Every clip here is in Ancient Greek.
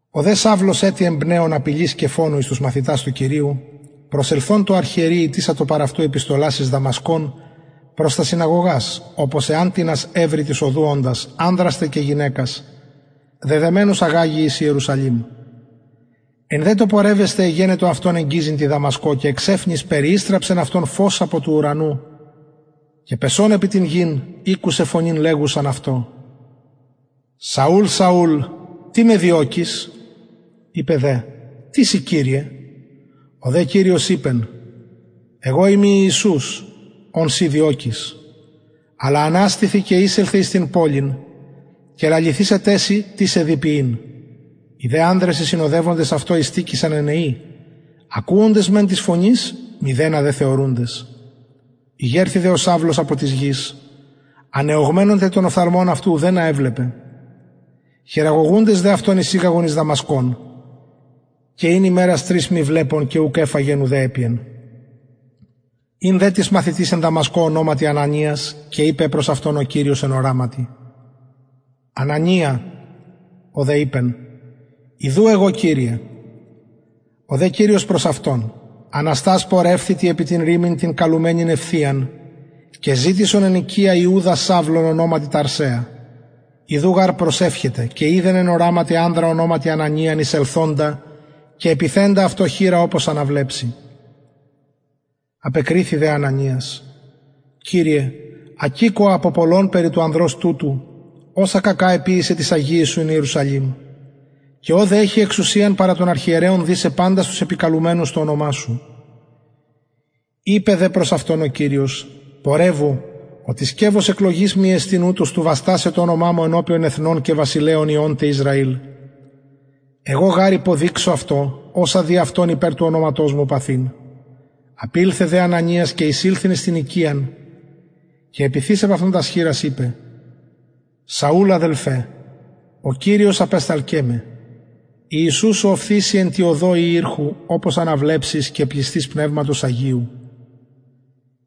ο δε σαυλος ετι εμπνεων απειλης και φονου εις τους μαθητας του κυριου προσελθων τω αρχιερει ητησατο παρ αυτου επιστολας εις δαμασκον προς τας συναγωγας οπως εαν τινας ευρη της οδου οντας ανδρας τε και γυναικας δεδεμενους αγαγη εις ιερουσαλημ εν δε τω πορευεσθαι εγενετο αυτον εγγιζειν τη δαμασκω και εξαιφνης περιηστραψεν αυτον φως απο του ουρανου και πεσων επι την γην ηκουσεν φωνην λεγουσαν αυτω σαουλ σαουλ τι με διωκεις ειπεν δε τις ει κυριε ο δε κυριος ειπεν εγω ειμι ιησους ον συ διωκεις αλλα αναστηθι και εισελθε εις την πολιν και λαληθησεται σοι τι σε δει ποιειν οι δε ανδρες οι συνοδευοντες αυτω ειστηκεισαν ενεοι ακουοντες μεν της φωνης μηδενα δε θεωρουντες ηγερθη δε ο σαυλος απο της γης ανεωγμενων τε των οφθαλμων αυτου ουδενα εβλεπεν χειραγωγουντες δε αυτον εισηγαγον εις δαμασκον και ην ημερας τρεις μη βλεπων και ουκ εφαγεν ουδε επιεν ην δε τις μαθητης εν δαμασκω ονοματι ανανιας και ειπεν προς αυτον ο κυριος εν οραματι ανανια ο δε ειπεν ιδου εγω κυριε ο δε κυριος προς αυτον αναστας πορευθητι επι την ρυμην την καλουμενην ευθειαν και ζητησον εν οικια ιουδα σαυλον ονοματι ταρσεα ιδου γαρ προσευχεται και ειδεν εν οραματι ανδρα ονοματι ανανιαν εισελθοντα και επιθεντα αυτω χειρα οπως αναβλεψη απεκριθη δε ανανιας κυριε ακηκοα απο πολλων περι του ανδρος τουτου οσα κακα εποιησεν τοις αγιοις σου εν ιερουσαλημ και ωδε εχει εξουσιαν παρα των αρχιερεων δησαι παντας τους επικαλουμενους το ονομα σου ειπεν δε προς αυτον ο κυριος πορευου οτι σκευος εκλογης μοι εστιν ουτος του βαστασαι το ονομα μου ενωπιον εθνων και βασιλεων υιων τε ισραηλ εγω γαρ υποδειξω αυτω οσα δει αυτον υπερ του ονοματος μου παθειν απηλθεν δε ανανιας και εισηλθεν εις την οικιαν και επιθεις επ αυτον τας χειρας ειπεν σαουλ αδελφε ο κυριος απεσταλκεν με ο οφθεις σοι εν τη οδω η ηρχου οπως αναβλεψης και πλησθης πνευματος αγιου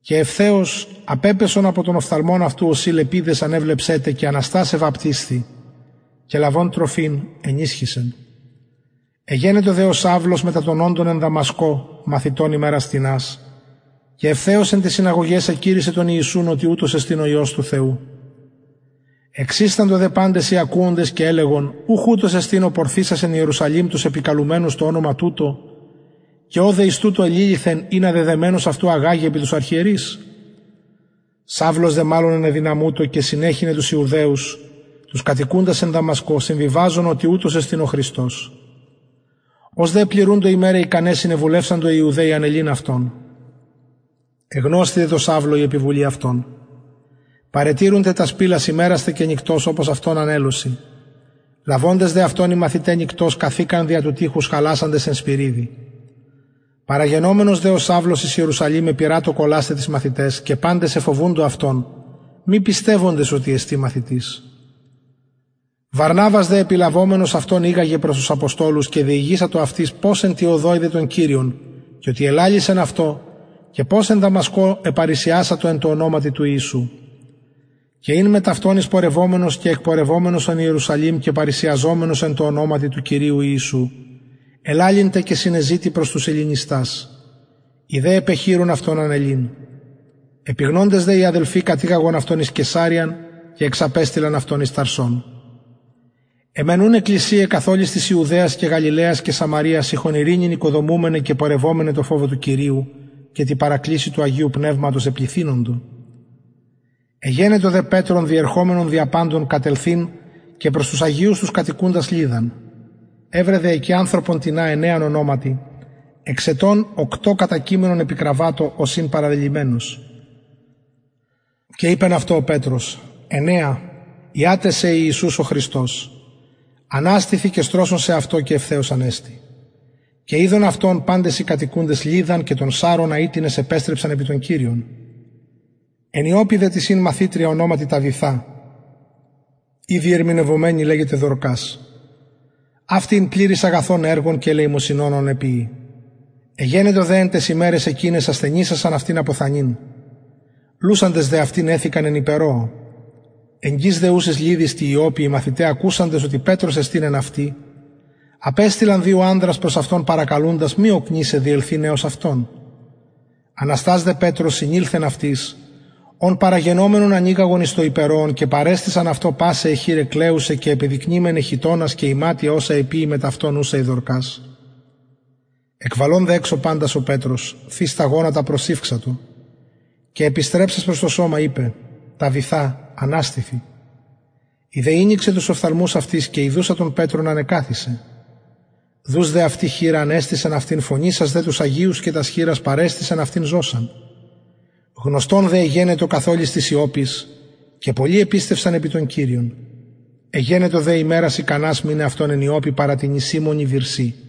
και ευθεως απεπεσον απο των οφθαλμων αυτου ωσει λεπιδες ανεβλεψεν τε και αναστας εβαπτισθη και λαβων τροφην ενισχυσεν εγενετο δε ο σαυλος μετα των εν δαμασκω μαθητων ημερας τινας και ευθεως εν ταις συναγωγαις εκηρυσσεν τον χριστον οτι ουτος εστιν ο υιος του θεου εξισταντο δε παντες οι ακουοντες και ελεγον ουχ ουτος εστιν ο πορθησας εν ιερουσαλημ τους επικαλουμενους το ονομα τουτο και ωδε εις τουτο εληλυθεν ινα δεδεμενους αυτους αγαγη επι τους αρχιερεις σαυλος δε μαλλον ενεδυναμουτο και συνεχυνεν τους ιουδαιους τους κατοικουντας εν δαμασκω συμβιβαζων οτι ουτος εστιν ο χριστος ως δε επληρουντο ημεραι ικαναι συνεβουλευσαντο οι ιουδαιοι ανελειν αυτον εγνωσθη δε τω σαυλω η επιβουλη αυτων παρετηρουν τε τας πυλας ημερας τε και νυκτος οπως αυτον ανελωσιν λαβοντες δε αυτον οι μαθηται νυκτος καθηκαν δια του τειχους χαλασαντες εν σπυριδι παραγενομενος δε ο σαυλος εν ιερουσαλημ επειρατο κολλασθαι τοις μαθηταις και παντες εφοβουντο αυτον μη πιστευοντες οτι εστιν μαθητης βαρναβας δε επιλαβομενος αυτον ηγαγεν προς τους αποστολους και διηγησατο αυτοις πως εν τη οδω ειδεν τον κυριον και οτι ελαλησεν αυτω και πως εν δαμασκω επαρρησιασατο εν τω ονοματι του ιησου και ην μετ αυτων εισπορευομενος εις ιερουσαλημ και παρρησιαζομενος εν τω ονοματι του κυριου ιησου ελαλει τε και συνεζητει προς τους ελληνιστας οι δε επεχειρουν αυτον ανελειν επιγνοντες δε οι αδελφοι κατηγαγον αυτον εις καισαρειαν και εξαπεστειλαν αυτον εις ταρσον αι μεν ουν εκκλησιαι καθ ολης της ιουδαιας και γαλιλαιας και σαμαρειας ειχον ειρηνην οικοδομουμεναι και πορευομεναι τω φοβω του κυριου και τη παρακλησει του αγιου πνευματος επληθυνοντο εγενετο δε πετρον διερχομενον δια παντων κατελθειν και προς τους αγιους τους κατοικουντας λυδδαν ευρεν δε εκει ανθρωπον τινα αινεαν ονοματι εξ ετων οκτω κατακειμενον επι κραββατω ος ην παραλελυμενος και ειπεν αυτω ο πετρος αινεα ιαται σε ιησους ο χριστος αναστηθι και στρωσον σεαυτω και ευθεως ανεστη και ειδον αυτον παντες οι κατοικουντες λυδδαν και τον ασσαρωνα οιτινες επεστρεψαν επι τον κυριον εν ιοππη δε τις ην μαθητρια ονοματι ταβηθα η διερμηνευομενη λεγεται δορκας αυτη ην πληρης αγαθων εργων και ελεημοσυνων ων εποιει εγενετο δε εν ταις ημεραις εκειναις ασθενησασαν αυτην αποθανειν λουσαντες δε αυτην εθηκαν εν υπερωω εγγυς δε ουσης λυδδης τη ιοππη οι μαθηται ακουσαντες οτι πετρος εστιν εν αυτη απεστειλαν προς αυτον παρακαλουντες μη οκνησαι διελθειν εως αυτων αναστας δε πετρος συνηλθεν αυτοις ον παραγενομενον ανηγαγον εις το υπερωον και παρεστησαν αυτω πασαι αι χηραι κλαιουσαι και επιδεικνυμεναι χιτωνας και ιματια οσα εποιει μετ αυτων ουσα η δορκας εκβαλων δε εξω παντας ο πετρος θεις τα γονατα προσηυξατο και επιστρεψας προς το σωμα ειπεν ταβηθα αναστηθι η δε ηνοιξεν τους οφθαλμους αυτης και ιδουσα τον πετρον ανεκαθισεν δους δε αυτη χειρα ανεστησεν αυτην φωνησας δε τους αγιους και τας χηρας παρεστησεν αυτην ζωσαν γνωστον δε εγενετο καθ ολης της ιοππης και πολλοι επιστευσαν επι τον κυριον εγενετο δε ημερας ικανας μειναι αυτον εν ιοππη παρα τινι σιμωνι βυρσει